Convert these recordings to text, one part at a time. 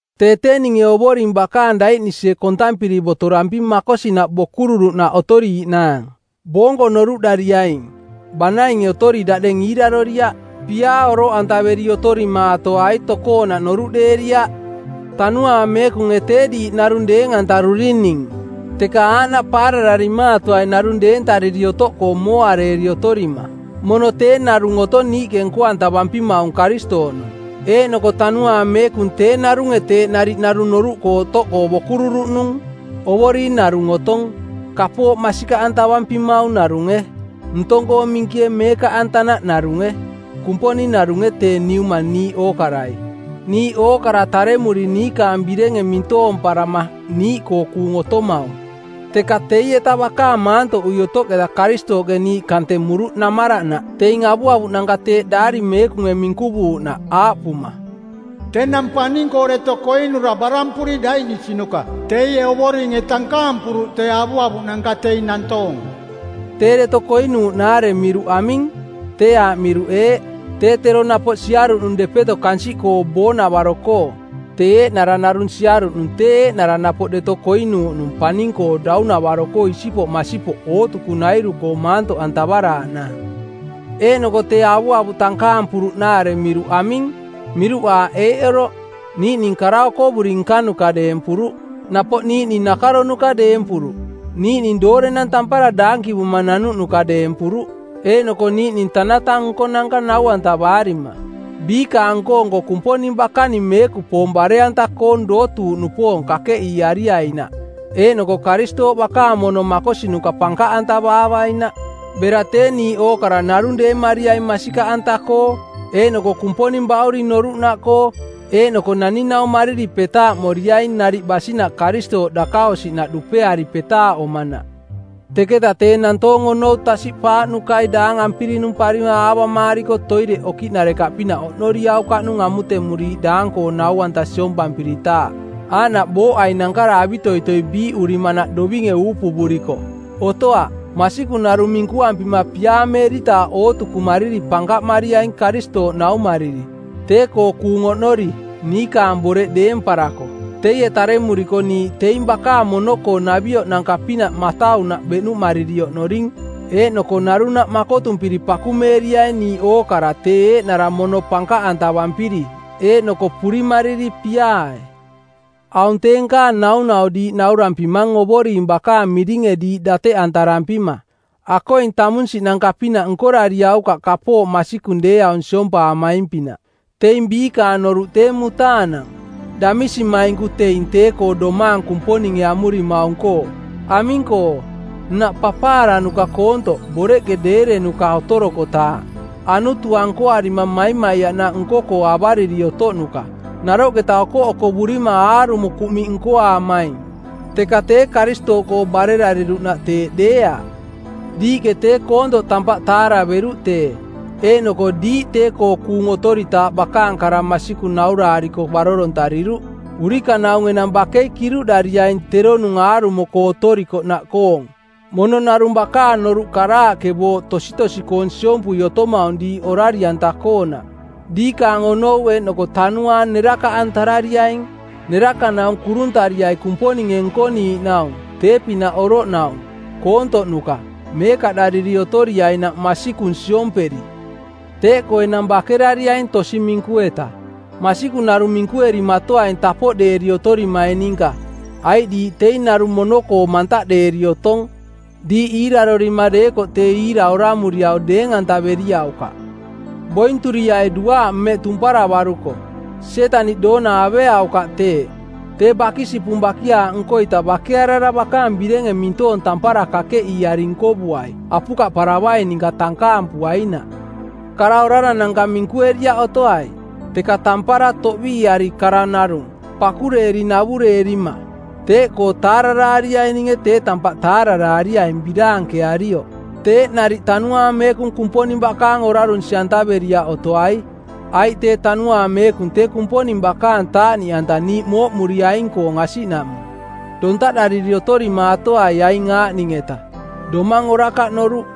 Tee tee ninge Ovoring bakaang daiꞌnisie kontampiri botoramping makosinaꞌ bokururuꞌnaꞌ otoriiꞌnaang. Boonko noruꞌdariaing, banainge otori daꞌdeng iiraroriaꞌ. Piaa oroꞌantaveri otorimaatoai tokoonaꞌ noruꞌdeeriaꞌ. Tanuaang Meekunge tee diiꞌ narung deeng-antarurining, teka aaꞌnaꞌ paarararimaatoai narung deentariri otoꞌkoo mooareeri otorima. Mono tee narung otong niiꞌke nko-antavampimaung Karistooꞌnung, eeꞌnoko Tanuaang Meekung tee narunge teeꞌ nariꞌ narung noruꞌkoo otoꞌkoo bokururuꞌnung. Ovoring narung otong, kapooꞌ masikaꞌantavampimaung narunge, ntong-koo minkie meekaꞌanta narunge; Kumponing narunge tee Niuma niiꞌ ookarai, niiꞌ ookara taremuri niikaang birenge mintoomparama niiꞌkoo kuung otomaung. Teka teieta bakaang maantoꞌui otoꞌketa Karistooꞌke niiꞌ kantemuruꞌ namaranaꞌ teing avuavuꞌnanka teeꞌ Daari Meekunge minkuvuuꞌnaꞌ aaꞌpuma: “‘Tenang paning-koo deto koinura barampuri daiꞌnisinuka teie Ovoringe tankaampuruꞌ tee avuavuꞌnanka teing nantoong.” Tee “deto koinuuꞌ”-naare miruꞌ aming? Tee aaꞌ miruꞌ eeꞌ: Tee tero napoꞌ siaruꞌnung depeto kansiꞌkoo boonavaro-koo. Tee eeꞌnara narung siaruꞌnung tee eeꞌnara napoꞌ deto koinuuꞌnung paning-koo daunavaro-koo isipoꞌ masipoꞌ ootukunairu-koo maantoꞌantavaraaꞌnaang. Eeꞌnoko tee “avuavuꞌ tankaampuruꞌ”-naare miruꞌ aming? Miruꞌ aaꞌ eeꞌ oroꞌ: Niiꞌning kara okovuri nkanuka deempuruꞌ, napoꞌ niiꞌning nakaronuka deempuruꞌ, niiꞌning doorenang tampara daankivuma nanuꞌnuka deempuruꞌ eeꞌnoko niiꞌning tanata nkonanka nau-antavaarima. Biikaang nko-nko Kumponing bakaning meekupoong bare-anta-koong dootuuꞌnupoong kakeꞌiiariainaꞌ eeꞌnoko Karistooꞌ bakaang mono makosinuka pankaꞌantavaavainaꞌ. Bera tee niiꞌ ookara narung deemariaing masikaꞌanta-koo eeꞌnoko Kumponing Bauring noruꞌnaꞌkoo, eeꞌnoko naning-naummariri petaaꞌmoriaing nariꞌ basinaꞌ Karistooꞌ dakaosiꞌnaꞌ dupeari petaaꞌomanaꞌ. Teketa tee nantoong onou tasiꞌpaaꞌnukai daang ampirinumparima˜ aavamaariko toireꞌ okiꞌnarekaꞌpinaꞌ oꞌnoriaukaꞌnung amutemuriiꞌ daang-koong nau-anta siompampiritaaꞌ, aaꞌnaꞌ booꞌai nankara avitoitoi biiꞌurimanaꞌ dovinge uupuvuriko. Otoaꞌ, masikung narung minkuampima piaameeritaaꞌ ootukumariri pankaꞌmariaing Karistooꞌnaummariri, tee-koo kuung oꞌnori, niikaang boreꞌ deemparako. Teie taremuriko niiꞌ teing bakaang mono-koo-navioꞌnanka-pinaꞌ mataunaꞌ beꞌnuꞌmariri oꞌnoring eeꞌnoko narunaꞌ makotumpiri pakumeeriaing niiꞌ ookara tee eeꞌnara mono pankaꞌantavampiri eeꞌnoko purimariri piaae. Aung tee nkaang naunau diiꞌ naurampimang Ovoring bakaang miringe diiꞌ dateꞌantarampima: Akoing tamunsiꞌnanka-pinaꞌ nkorariaukaꞌ kapooꞌ masikung deeaung siompaamaing-pinaꞌ. Teing biikaang noruꞌ tee mutaanang, damisimainku teing tee-koo domaang Kumponinge amurimaung-koo. Aming-koo, nnaꞌ papaaranuka koontoꞌ, boreꞌke deerenuka otorokotaaꞌ. Anutua nkoarima maimaiaꞌnaꞌ nko-koo avariri otoꞌnuka, naroꞌketa okoꞌokovurima aarumo kuꞌmiꞌ nkoaamaing. Teka tee Karistooꞌkoo barerariruꞌnaꞌ teeꞌ deeaꞌ. Diiꞌke tee koontoꞌ tampaꞌ taaraveruꞌ tee, eeꞌnoko diiꞌ tee-koo kuung otoritaaꞌ bakaang kara masikung nauraariko barorontariruꞌ. Urikanaung enang bakei kiruꞌdariaing teronung aarumo-koo otorikoꞌnaꞌkoong, mono narung bakaang noruꞌ karaaꞌke booꞌ tositosi-koong siompui otomaung diiꞌ orari-anta-koonaꞌ. Diikaang onou eeꞌnoko tanuaang nerakaꞌantarariaing. Nerakanaung kuruntariai Kumponinge nkoniiꞌnaung, tee-pinaꞌ oroꞌnaung, koontoꞌnuka, meekaꞌdariri otoriainaꞌ masikung siomperi. Teeꞌkoo enang bakerariaing tosi minku-eta. Masikung narung minkuerimatoaing tapoꞌdeeri otorimaing ninka, aiꞌ diiꞌ teing narung mono-koo mantaꞌdeeri otong. Diiꞌ iirarorima deekoꞌ tee iira oramuriau deeng-antaveriaukaꞌ. Bointuriai duaaꞌ mmeꞌ tumparavaruko. Sietaniꞌ doona aveaukaꞌ teeꞌ. Tee bakisipung bakiaaꞌ nko-ita bakearara bakaang birenge mintoong tampara kakeꞌiiari nkovuai apukaꞌparavaing ninka tankaampuainaꞌ. Kara orarananka minkueriaꞌ otoai, teka tampara toꞌbiiari kara narung, pakureeri navureerima. Teeꞌkoo taararaariaininge tee tampaꞌ taararaariaing biraankearioꞌ. Teeꞌ nariꞌ Tanuaang Meekung Kumponing bakaang orarunsi-antaveriaꞌ otoai, aiꞌ tee Tanuaang Meekung tee Kumponing bakaang taaꞌniꞌanta niiꞌ mooꞌmuriaing-koong asiꞌnaꞌmung. Dontaꞌdariri otorimaatoai aing aaꞌning-etaꞌ, domang orakaꞌ noruꞌ,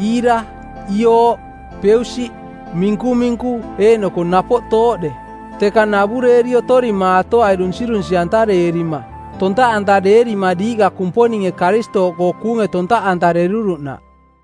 iira, iooꞌ, peusiꞌ, minkuminku eeꞌnoko napoꞌ tooꞌde. Teka navureeri otorimaatoai dunsirunsi˜antareerima, tontaꞌantareerima diiꞌka Kumponinge Karistooꞌkoo kuunge tontaꞌantareruruꞌnaꞌ.